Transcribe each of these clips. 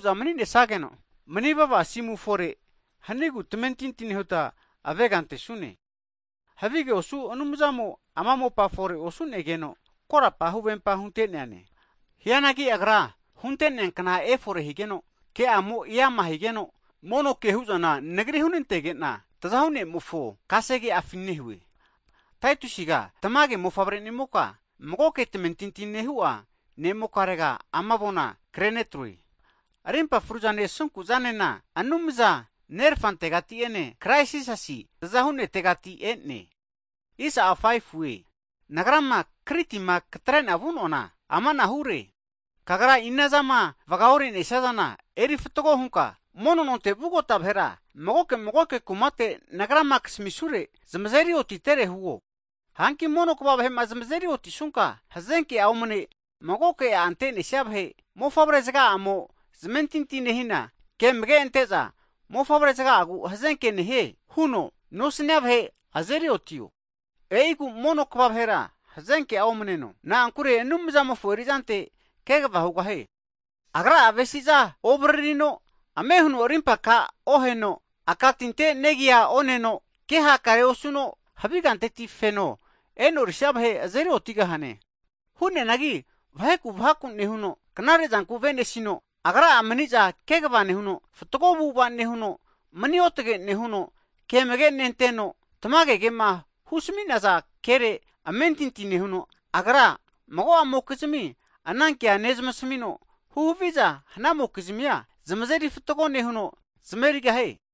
Ana nehanagena zamaza hanuge'za Anumzamo'ma manivava asimuku'ma hu'negu tamentinti nehuta avega antesune. Havige osu Anumzamo ama mopa fore osu'negeno, korapa huvempa hunte'neane. Hianagi Agrama hunte'nea kna efore higeno, ke'amo eama higeno, mono ke hu'zana nagri hunantege'na, Anumza Tazahu ne'mofo (Savior) kasege'afi nehue. Taitusiga tamage mofavre'nimoka, magoke tamentinti nehu'a ne'mokarega ama avona kre negamue, Arimpa fruzane, asunku'zanena, Anumza Nerfantegati ene, Krais Jisasi tazahuno taguvazi ne'mo'a asunkuzama'aretira karimpa frua kamigahie. Hagi nagrama Kritima katre'na vu'noana amanahure, kagra inazama vagaore'nesia zana eri fatgo hunka, mono nonte vugota vahera (elda) magoke magoke kumatera nagrama kasamisure antenka zamazeri otitere huo. Hanki mono kva vahe'ma zamazeri otisunka, hazenke'a omane, magoke a' ante'nesia vahe'ma, mofavre zaga'amo zamentinti nehina, ke amage'a nentesageno, mofavre zaga'agu hazenke nehaze huza nosnia vahe azeri otio. E'igu mono kva vahera hazenke'a omneno, na'ankure Anumzamofo eri'zante kegava hugahie. Agra'a avesi'za ovaririno, ame huno rimpa aka oheno, aka tinte negia oneno, ke hakare osuno, havi kanteti feno e'norisia vahe azeri otigahane. Hu'neanagi vaheku vhaku'ma nehuno, knare'zanku avenesino, agra'a mani'za kegava nehuno, fatgo avu'ava nehuno, mani otage nehuno, ke amage' nenteno, tamage kema husmi'naza kere amentinti nehuno, agra mago'amokizmia so'e ke nezmasmino, huhaviza hanamokizmi'a zamazeri fatgo nehuno, zamaveri hugahie.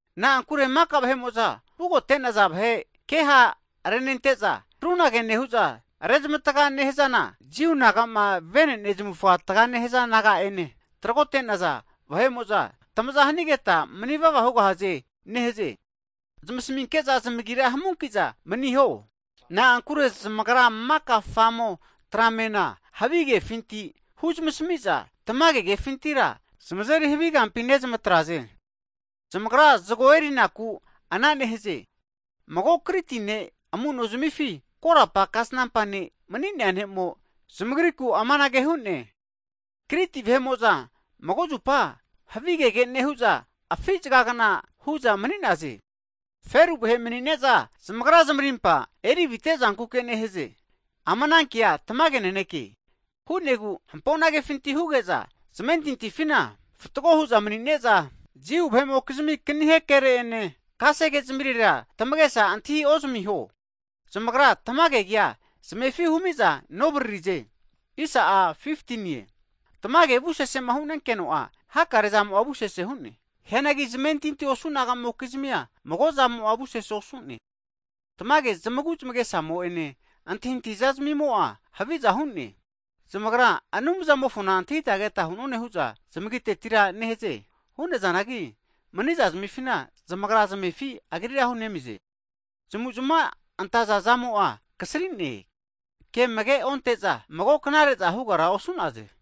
Na'ankure maka vahe'mo'za vugote'naza vahe kea ha' renezmante'za, rumokizmigu krunage nehu'za rezmatga nehazana Jiu naga'ma vene'ne zamufa taga nehaza naga'ene tragote'naza vahe'mo'za anara nehaze. Zamasminke'za zamagira hamunki'za maniho, na'ankure zamagra maka famo, tramena havi kefinti huzmasmi'za tamage kefintira, zamazeri havi kampi nezmatraze. Zamagra zago erinaku ana nehaze. Mago Kriti ne' amu'no zamifi korapa kasnampa ne' (profet) mani'nea ne'mo, zamagriku amanage hu'ne, Kriti vahe'mo'za maka zupa havigege nehu'za afi' zagagafagna hu'za mani'naze. Feru vahe mani'ne'za, zamagra zamarimpa eri avite zankuke nehaze. Ama kea tamage naneke, hu'negu hampo'na kefinti huge'za, zamentintifina fatgo hu'za mani'ne'za, Jiu vahe'mokizmi kanihe kere'ene, kase ke zamirera, tamagesa antahiozamiho zamagra tamage kea zamefi humi'za novaririze. Tamage, hakare veamo'za avusesema hu'nenageno'a hakare zamo'a avusese hu'ne. Hianagi zamentinti osu namokizmi'a, mago zamo'a avusese osu'ne. Tamage zamagu zamagesamo ene antahintahi zamimo'a haviza hu'ne. Zamagra Anumzamofona antahita keta hu'none hu'za zamagitetira nehaze. Hu'nazanagi, mani'zazmifina zamagra zamefi Agrira hunemize. Zamavuzavamo'a kasrigeno, kea amage onte'za, mago knare'za hugara osu'naze.